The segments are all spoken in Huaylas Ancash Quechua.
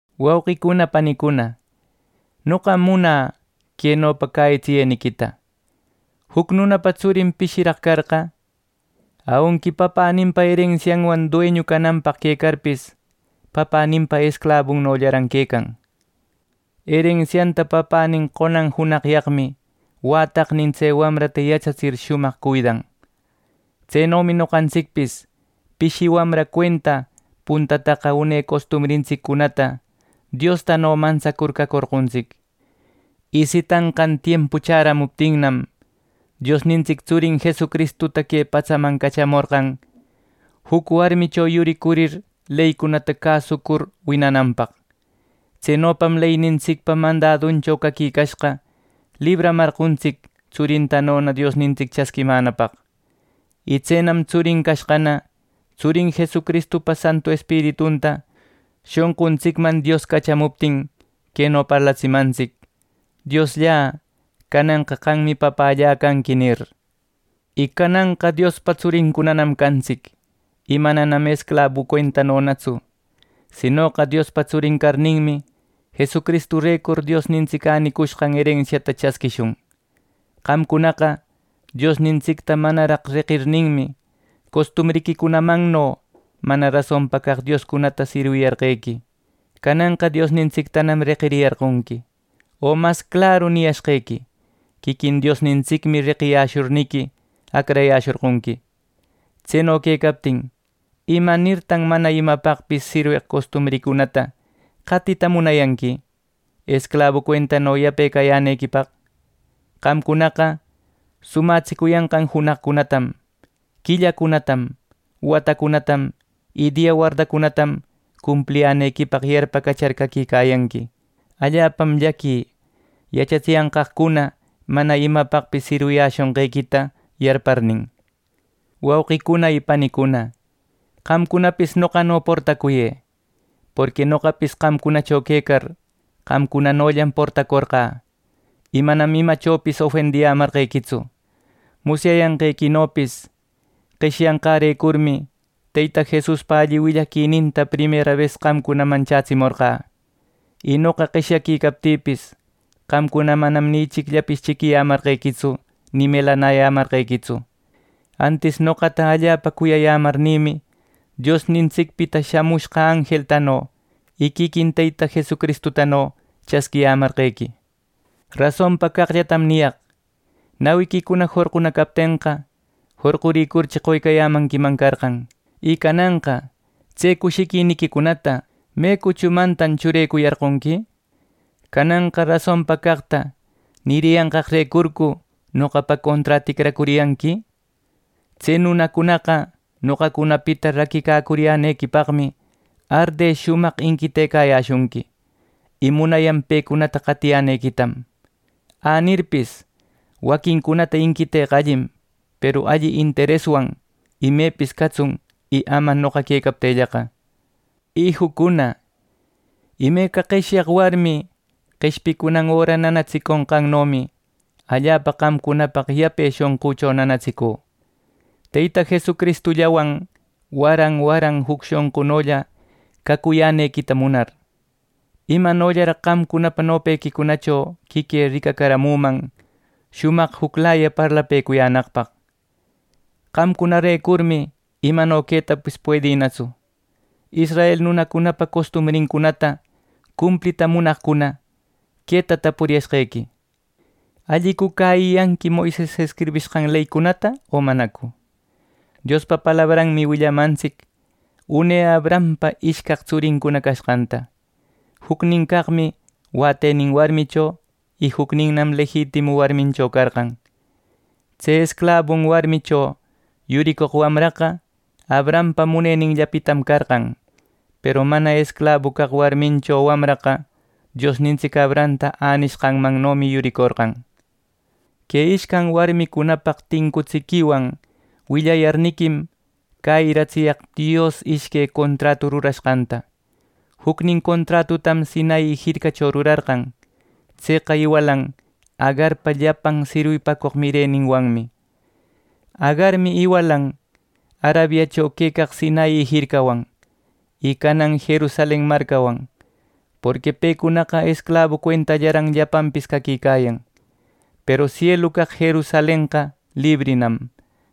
Wauqicuna panicuna, noqam munä quenopa cäyitsiyeniquita: Juc nunapa tsurin pishiraq carqa, aunqui papäninpa erensianwan dueñu cananpaq quecarpis, papäninpa esclabuncunanollaran quecan. Erensianta papänin qonan junaqyaqmi wätaqnin tse wamrata yachatsir shumaq cuidan. Tsenomi noqantsicpis pishi wamra cuenta puntataqa une costumbrintsiccunata Diostano mantsacur cacorqontsic. Y sitanqan tiempu chäramuptinnam, Diosnintsic tsurin Jesucristuta que patsaman cachamorqan juc warmicho yuricurir leycunata cäsucur winananpaq. Tsenopam leynintsicpa mandaduncho caquicashqa libraramarqontsic tsurintanona Diosnintic chasquimänapaq. Y tsenam tsurin cashqana, Tsurin Jesucristupa Santu Espiritunta shonquntsicman Dios cachamuptin queno parlatsimantsic: “¡Diosllä, cananqa qammi Papällä canqui!” nir. Y cananqa Diospa tsurincunam cantsic. Y manam esclabu cuentanonatsu; sinoqa Diospa tsurin carninmi, ˻Jesucristurecur˼ Diosnintsic änicushqan erensiata chasquishun. Qamcunaqa Diosnintsicta manaraq reqirninmi, costumbriquicunamanno mana rasonpa caq dioscunata sirwiyarqequi. Cananqa Diosnintsictanam reqiriyarqonqui, o mas claru niyashqequi, quiquin Diosnintsicmi reqiyäshurniqui, acrayäshorqonqui. Tseno quecaptin, ¿Imanirtan mana imapaqpis sirweq costumbriquicunata qatita munayanqui, esclabu cuentano yape cayänequipaq! Qamcunaqa sumatsicuyanqan junaqcunatam, quillacunatam, watacunatam y dia wardacunatam cumpliyänequipaq yarpacachar caquicayanqui. Allapam llaquï yachatsiyanqaqcuna mana imapaqpis sirwiyäshonqequita yarparnin. Wauqicuna y panicuna, qamcunapis noqano portacuyë. Porqui noqapis qamcunacho quecar, qamcunanollam portacorqä. Y manam imachopis ofendiyämarqequitsu. Musyayanqequinopis qeshyanqärecurmi Teyta Jesuspa alli willaquininta primera bes qamcunaman chätsimorqä. Y noqa qeshyaquicaptïpis qamcuna manam ni ichicllapis chiquiyämarqequitsu ni melanayämarqequitsu. Antis noqata allapa cuyayämarnïmi, Diosnintsicpita shamushqa anjeltano y quiquin Teyta Jesucristutano chasquiyämarqequi. Rasonpa caqllatam niyaq. Nawiquicuna jorquna captenqa jorquricurchi qoycayämanquiman carqan. Y cananqa ¿tse cushiquiniquicunata me cuchumantan churecuyarqonqui? ¿Cananqa rasonpa caqta niriyanqaqrecurcu noqapa conträ ticracuriyanqui! Tse nunacunaqa noqacunapita raquicacuriyänequipaqmi arde shumaq inquitecayäshunqui. Y munayan pecunata qatiyänequitam. Änirpis, waquincunata inquiteqa allim, peru alli intereswan imepis catsun y ama noqa quecaptïllaqa. Ijücuna, imeca qeshyaq warmi qeshpicunan öra nanatsiconqannomi, allapa qamcunapaq yape shonqücho nanatsicü, Teyta Jesucristullawan waran waran juc shonqunolla cacuyänequita munar. ¡Imanollaraq qamcunapa nopequicunacho quiquï ricacaramüman shumaq juclaya parlapëcuyänaqpaq! ¡Qamcunarecurmi imano quetapis puedïnatsu! Israel nunacunapa costumbrincunata cumplita munaqcuna, queta tapuriyashqequi: ¿Allicu cäyiyanqui Moises escribishqan leycunata, o manacu! Diospa palabranmi willamantsic une Abrahampa ishcaq tsurin cashqanta. Juc caqmi wätenin warmicho y jucninnam lejitimu warmincho carqan. Tse esclabun warmicho yuricoq wamraqa Abrahampa muneninllapitam carqan, peru mana esclabu caq warmincho wamraqa Diosnintsic Abrahamta änishqanmannomi yuricorqan. Que ishcan warmicunapaq tincutsiquiwan willayarniquim cäyiratsiyaq Dios ishque contratuta rurashqanta. Jucnin contratutam Sinai jircacho rurarqan. Tseqa iwalan Agarpa llapan sirwipacoq mireninwanmi. Agarmi iwalan Arabiacho quecaq Sinai jircawan, y canan Jerusalen marcawan. Porqui pecunaqa esclabu cuentallaran llapanpis caquicayan. Peru sielu caq Jerusalenqa librinam.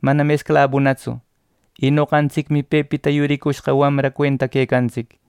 Manam esclabunatsu y noqantsicmi pepita yurishqa wamra cuenta quecantsic.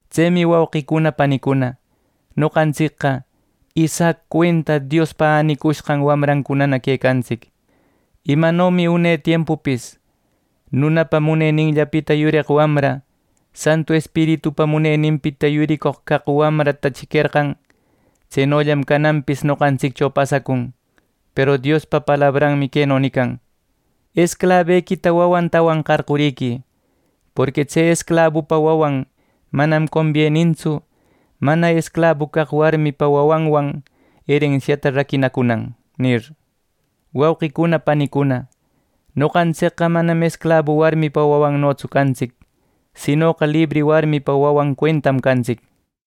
Tsemi wauqicuna panicuna, noqantsicqa Isaac cuenta Diospa änicushqan wamrancunana quecantsic. Imanomi une tiempupis nunapa muneninllapita yureq wamra, Santu Espiritupa muneninpita yuricoq caq wamrata chiquerqan; tsenollam cananpis noqantsiccho pasacun. Peru Diospa palabranmi queno nican: “Esclabequita wawantawan qarquriquï. Porqui tse esclabupa wawan manam combiennintsu mana esclabu caq warmiquipa wawanwan erensiata raquinacunan” nir. Wauqicuna panicuna, noqantsicqa manam esclabu warmipa wawannotsu cantsic, sinoqa libri warmipa wawan cuentam cantsic.